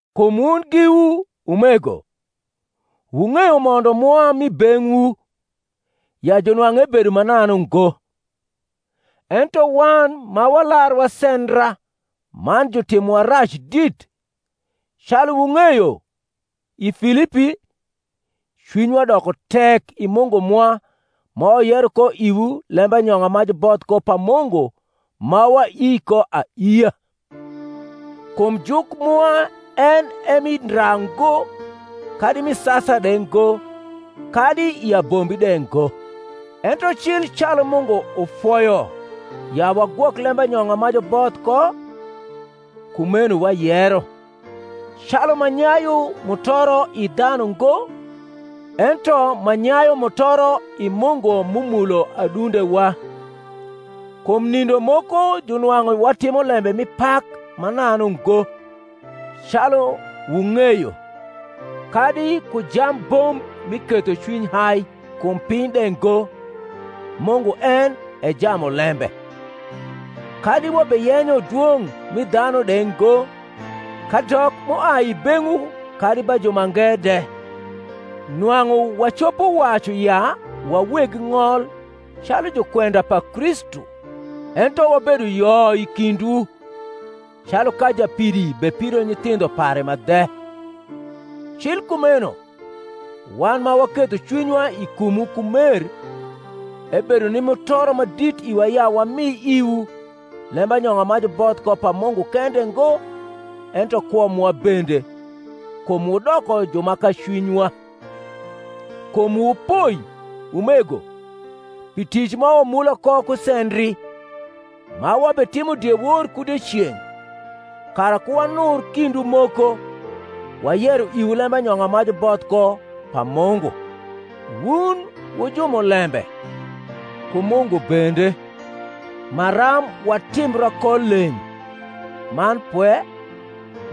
Kum wun giwu, umego, wung’eyo mondo mwa m’i beng’wu, ya junwang’u ebedo mananu ngo: ento wan ma walar wasendra man jutimowa rac dit, calu wung’eyo, i Filipi, cwinywa doko tek i Mungu mwa ma wayero ko iwu lembanyong’a ma juboth ko pa Mungu ma waii ko aiia. Kum juk mwa en e mi ndra ngo, kadi mi sasa de ngo, kadi i abombi de ngo: ento cil calu Mungu ufoyo ya wagwok lembanyong’a ma juboth ko, kumeno wayero; calu ma nyayu mutoro i dhanu ngo, ento ma nyayu mutoro i Mungu m’umulo adundewa. Kum nindo moko junwang’u watimo lembe mi pak mananu ngo, calu wung’eyo, kadi ku jambomb mi ketho cwiny hai kum piny de ngo, Mungu en e jamulembe; kadi wabeyenyo dwong’ mi dhanu de ngo, kadok m’uai i beng’wu kadi ba jumange de, nwang’u wacopo wacu ya wa weg ng’ol calu jukwenda pa Kristu. Ento wabedo yo i kindwu, calu ka japidi bepido nyithindho pare ma dhe: cil kumeno, wan ma waketho cwinywa i kumwu ku mer, ebedo ni mutoro ma dit iwa ya wami iwu, lembanyong’a ma juboth ko pa Mungu kende ngo, ento kwo mwa bende, kum wudoko ju ma kacwinywa. Kum wupoi, umego, pi tic ma wamula ko ku sendri: ma wabewatimo diewor ku dieceng’, kara ku wanur kindwu moko, wayero iwu lembanyong’a ma juboth ko pa Mungu. Wun wu jumulembe, ku Mungu bende, maram watimbra ko leng’, man pwe,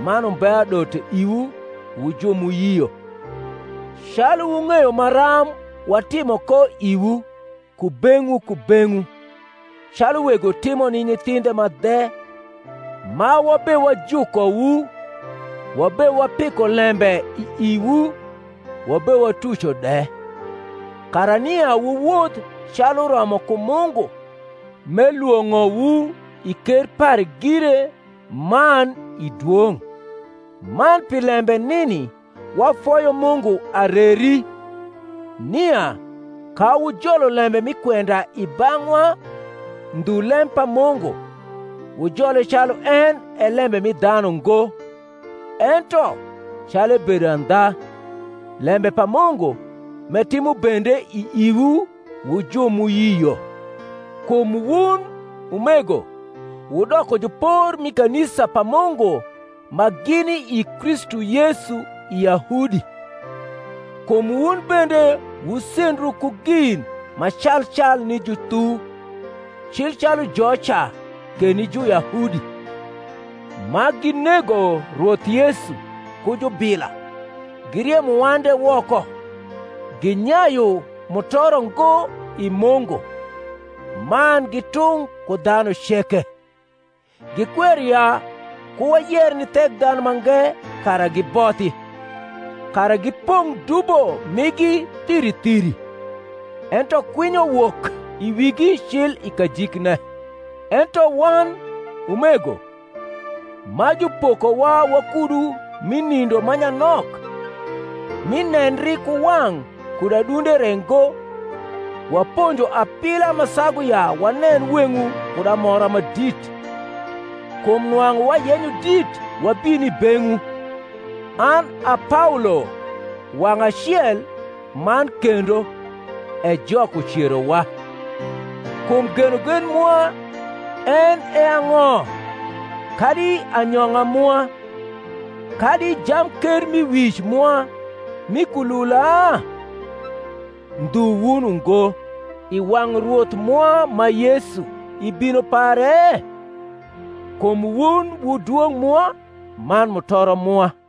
man umbe adote iwu wu ju m’uyio: calu wung’eyo maram watimo ko iwu kubeng’wu kubeng’wu, calu wego timo ni nyithindhe ma dhe, ma wabewajukowu, wabewapiko lembe i iwu, wabewatuco de, kara nia wuwoth calu uromo ku Mungu, m’elwong’owu i ker pare gire man i dwong’. Man pi lembe nini wafoyo Mungu areri, nia, ka wujolo lembe mi kwenda i bang’wa, ndhu lem pa Mungu, wujole calu en e lenibe mi dhanu ngo, ento, calu ebedo andha, lembe pa Mungu, m’etimo bende i iwu wu ju m’uyio. Kum wun, umego, wudoko jupor mi kanisa pa Mungu ma gini i Kristu Yesu i Yahudi: kum wun bende wusendru ku gin ma cal cal ni juthu, cil calu joca ke ni Juyahudi; ma ginego Rwoth Yesu ku jubila, giriemo wan de woko, ginyayu mutoro ngo i Mungu, man gi tung’ ku dhanu ceke; gikwero ya ku wayer ni Thekdhanumange kara gibothi; kara gipong’ dubo migi thiri thiri: ento kwinyo wok i wigi cil i kajikne. Ento wan, umego, ma jupokowa wakudu mi nindo ma nyanok, mi nendri ku wang’ kud adunde re ngo, waponjo apila ma sagu ya wanen weng’wu kud amora ma dit: kum nwang’u wayenyo dit wabin i beng’wu, an a Paolo wang’ acel man kendo; e Jok ucerowa. Kum genogen mwa en e ang’o, kadi anyong’a mwa, kadi jamkermiwic mwa mi kulula? Ndhu wun ungo, i wang’ Rwoth mwa ma Yesu i bino pare? Kum wun wu dwong’ mwa man mutoro mwa.